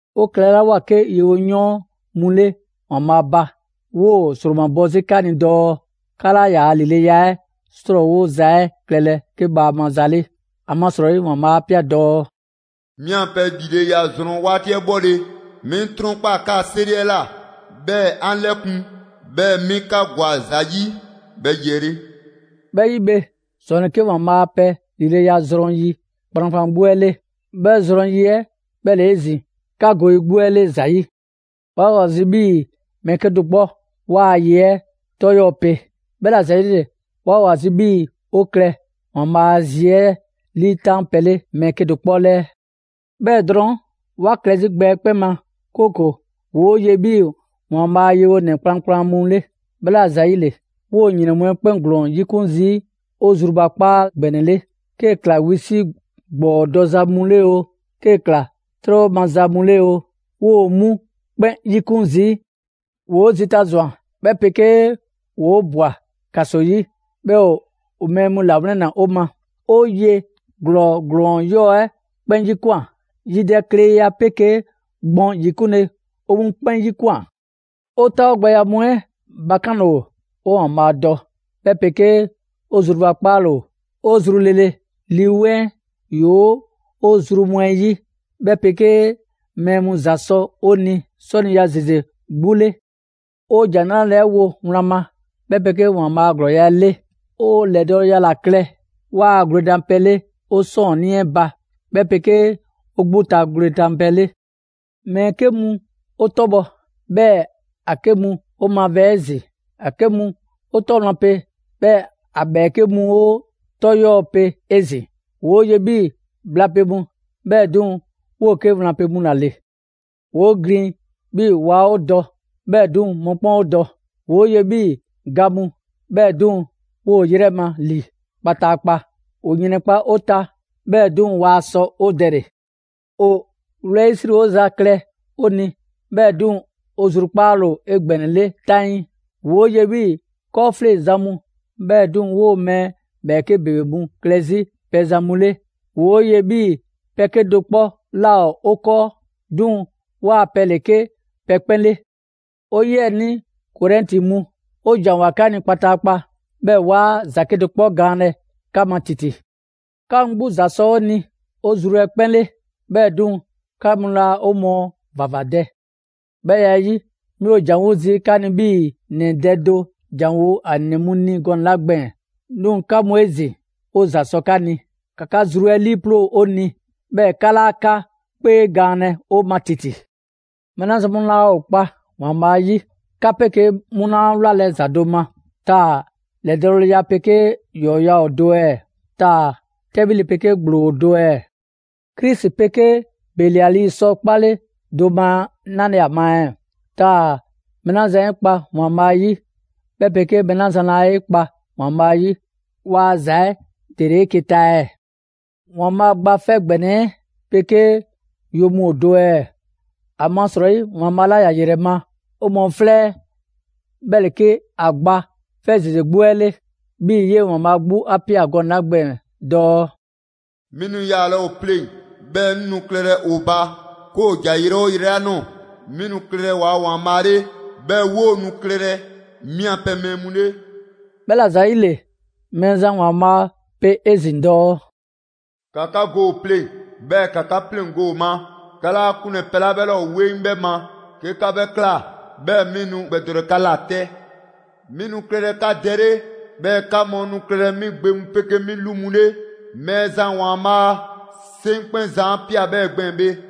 'O klɛlawoa 'ke yewoyɔɔn mu 'le ‑Waanbhaa' ba, 'woo‑ ‑sromabɔ 'zi 'ka ni dɔɔ 'ka 'laa ‑yaa' ‑lileya 'ɛ 'srɔɔwoza 'ɛ klɛlɛ 'ke bhaama za 'le. ‑Amasrɔyi ‑Waanbhaa' 'a ꞊pia dɔɔ: «'Mi 'a pɛ ‑lileya zrɔn 'waati 'ɛ 'bhɔle‑, 'mi 'ŋ 'trɔnkpaa‑ 'kaa‑ 'seri 'ɛ ꞊la, 'bhɛɛ‑ 'an 'lɛkun, 'bhɛɛ‑ 'mi 'ka ‑gwa ‑za 'yi 'bhɛ yi 'ɛ 'le.» 'Bhɛ 'yi bhe, ‑zɔn ‑le 'ke ‑Waanbhaa' a pɛ ‑lileya zrɔn yi kplankplan 'gbu 'ɛ 'le; 'bhɛɛ‑ ‑zɔn yi 'ɛ 'bhɛ ‑le 'ezin‑ 'ka go yi 'gbu 'ɛ 'le ‑za 'yi. 'Waa‑ ‑o ‑a zi 'bhii‑ mɛɛ 'kedo‑ 'kpɔ 'waa‑ ye 'ɛ 'tɔ 'yɔɔ‑ pe. 'Bhɛla‑ ‑zayile 'waa‑ ‑o ‑a zi 'bhii‑ 'o klɛ ‑Waanbhaa' a zi 'ɛ 'liitan pɛ 'le mɛɛ 'kedo‑ 'kpɔ 'lɛɛ. 'Bhɛɛ‑ drɔɔn', 'wa klɛ 'zi gbɛ 'ɛ 'kpɛn ma, 'kooko‑ ‑woo' ye 'bhii‑ ‑Waanbhaa' a yewonɛ kplankplan mu 'le. 'Bhɛla‑ ‑yile, 'woo‑ ‑yrɛn 'ɛ 'kpɛn ‑glɔɔn 'yikun zii' 'o zrubakpaa ‑gbɛnɛ 'le, 'kee‑ ꞊kla wisi' ‑gbɔɔ dɔza mu 'le oo, 'kee ꞊kla 'trɛbhɔza mu 'le 'oo, 'woo‑ 'mu 'kpɛn 'yikun zii'. ‑Woo' zita ꞊zwan, 'bhɛ 'pegee ‑woo 'o ꞊bwa ‑kaso 'yi, 'bhɛɛ‑ ‑o mɛɛ mu ‑lawlɛnna 'o ma. 'O ye ‑glɔɔ ‑glɔɔn 'yɔɔ‑ 'ɛ 'kpɛn 'yikwan꞊. Yidɛkleya 'pegee gbɔn yikunle, 'o 'mu 'kpɛn 'yikwan꞊. 'O 'taawogbɛya mu 'ɛ bakanle ‑o, 'o ‑Waanbhaa' dɔ, 'bhɛ 'pegee 'o zrubakpaale ‑o, 'o zru lele, Lii 'Weŋ 'ɛ ‑yoo 'o zru mu 'ɛ 'yi, 'bhɛ 'pegee mɛɛ mu ‑za sɔ 'o ni 'sɔniya ‑zeze 'gbu 'le. 'O ‑Jan 'nrale‑ 'ɛ wo wlan ma, 'bhɛ 'pegee ‑Waanbhaa' a ‑glɔɔya' 'ɛ 'le. 'O ‑lɛdɔɔleya ‑la klɛ 'waa‑ gwledanpɛ 'le 'o 'sɔɔnnii 'ɛ ba, 'bhɛ 'pegee 'o 'gbu ta gwledanpɛ 'le. Mɛɛ 'ke mu 'o 'tɔbhɔ‑, 'bhɛɛ‑ ‑a 'ke mu 'o mavɛɛ 'ezin‑. ‑A 'ke mu 'o 'tɔ wlan pe, 'bhɛɛ‑ ‑a ‑bhɛɛke' mu ‑o 'o 'tɔ 'yɔɔ‑ pe 'ezin‑. ‑Woo' ye 'bhii‑ bhla pe mu, 'bhɛɛ‑ 'duŋ‑ 'woo‑ 'ke wlan pe mu ‑la ‑le. ‑Woo' glin 'bhii‑ waa 'o dɔ, 'bhɛɛ‑ 'duŋ‑ mɔkpɛn' 'o dɔ. ‑Woo' ye 'bhii‑ ga mu, 'bhɛɛ‑ 'duŋ‑, 'woo‑ 'o 'yrɛ ma ‑li kpataakpa. ‑O ‑yrɛnkpa' 'o ta, 'bhɛɛ‑ 'duŋ‑ waa sɔ 'o dɛle‑. ‑O wlɛyisriwoza klɛ 'o ni, 'bhɛɛ‑ 'duŋ‑ 'o zrukpaale ‑o 'egbɛnɛle 'taŋii. ‑Woo' ye 'bhii‑ 'kɔɔfleŋzan mu, 'bhɛɛ‑ 'duŋ‑, 'woo‑ mɛɛ ‑bhɛɛke' ‑bebe mu klɛ 'zi pɛzan mu 'le. ‑Woo' ye 'bhii‑ pɛ 'kedo‑ 'kpɔ 'laa ‑o 'o 'kɔɔ, 'duŋ‑ 'waa‑ pɛ ‑le 'ke pɛ 'kpɛn 'le. 'O 'yiɛnii Korɛnti mu, 'o ‑janwoa 'ka ni kpataakpa, 'bhɛɛ‑ 'waa ‑za 'kedo‑ 'kpɔ gaanlɛ 'ka ma ‑titi. 'Ka mu 'gbu ‑za sɔ 'o ni 'o zru 'ɛ 'kpɛn 'le, 'bhɛɛ‑ 'duŋ‑ 'ka mu laa 'o mɔɔ ‑vavadɛ. 'Bhɛ ya 'ɛ 'yi, 'mi ‑o ‑janwo' zii' 'ka ni 'bhii‑ ‑nɛ dɛ do ‑janwo' ‑a ‑nɛ mu ni gɔnɛ‑ 'la gbɛɛn‑. 'Duŋ‑ 'ka mu 'ezin‑, 'o ‑za 'sɔ 'ka ni, ‑ka 'ka zru 'ɛ 'liiploo‑ 'o ni, 'bhɛɛ‑ 'ka 'laa 'ka 'kpee gaanlɛ 'o ma ‑titi. Mɛɛ 'la zan mu laa ‑o kpa ‑Waanbhaa' 'yi, 'ka 'pegee 'mu laa wlalɛ ‑za do ma. Taa‑ ‑lɛdɔɔleya 'pegee ‑yɔɔya' ‑o do ɛɛ? Taa‑ 'tɛbhile 'pegee ‑gblo ‑o do ɛɛ? Krisi 'pegee Beliali 'sɔ 'kpale do ma 'nale‑ ‑a ma ɛɛ? Taa‑ mɛɛ 'la zan 'e kpa ‑Waanbhaa' 'yi, 'bhɛ 'pegee mɛɛ 'la zan laa 'e kpa ‑Waanbhaa' ‑yi ‑waa' ‑za 'ɛ ‑dele 'eke‑ ta ɛɛ? ‑Waanbhaa' Gba 'Fɛ ‑Gbɛnɛ 'ɛ 'pegee yo mu ‑o do ɛɛ? ‑Amasrɔyi ‑Waanbhaa' 'la ‑ya ‑yrɛ ma 'o mɔɔ 'flɛ 'ɛ 'bhɛ ‑le 'ke ‑a gba 'fɛ ‑zeze 'gbu 'ɛ 'le, 'bhii‑ 'yee‑ ‑Waanbhaa' 'gbu 'a ꞊pia gɔnɛ‑ 'la gbɛɛn‑ dɔɔ: «'Mi nu yaalɛ ‑o pleŋ‑, 'bhɛɛ‑ 'ŋ nu klɛlɛ ‑o ba 'ke ‑o ‑ja yrɛ 'oo yrɛ 'la ꞊nɔɔ. 'Mi nu klɛlɛ waa ‑Waanbhaa' 'le, 'bhɛɛ‑ 'woo‑ nu klɛlɛ 'mi a pɛ mɛɛ mu 'le.» 'Bhɛla‑ ‑zayile, Mɛɛzan ‑Waanbhaa' pe 'ezin‑ dɔɔ: «‑Ka 'ka go ‑o pleŋ‑; 'bhɛɛ‑ ‑ka 'ka 'pleŋgo‑ ‑o ma. 'Ka 'laa 'kunlɛ‑ pɛ 'la 'bhɛ 'laa ‑o 'weŋ 'bhɛ ma. 'Ke 'ka 'bhɛ ꞊kla, 'bhɛɛ‑ 'mi nu 'ŋ gbɛdɔlɛ 'ka ꞊la 'tɛ. 'Mi nu klɛlɛ 'ka Dɛ 'le, 'bhɛɛ‑ 'ka mu nu klɛlɛ 'mi gbe mu 'pegee 'mi 'lu mu 'le. Mɛɛzan ‑Waanbhaa' 'Seŋkpɛnzan 'a ꞊pia 'bhɛɛ‑ gbɛɛn‑ bhe.»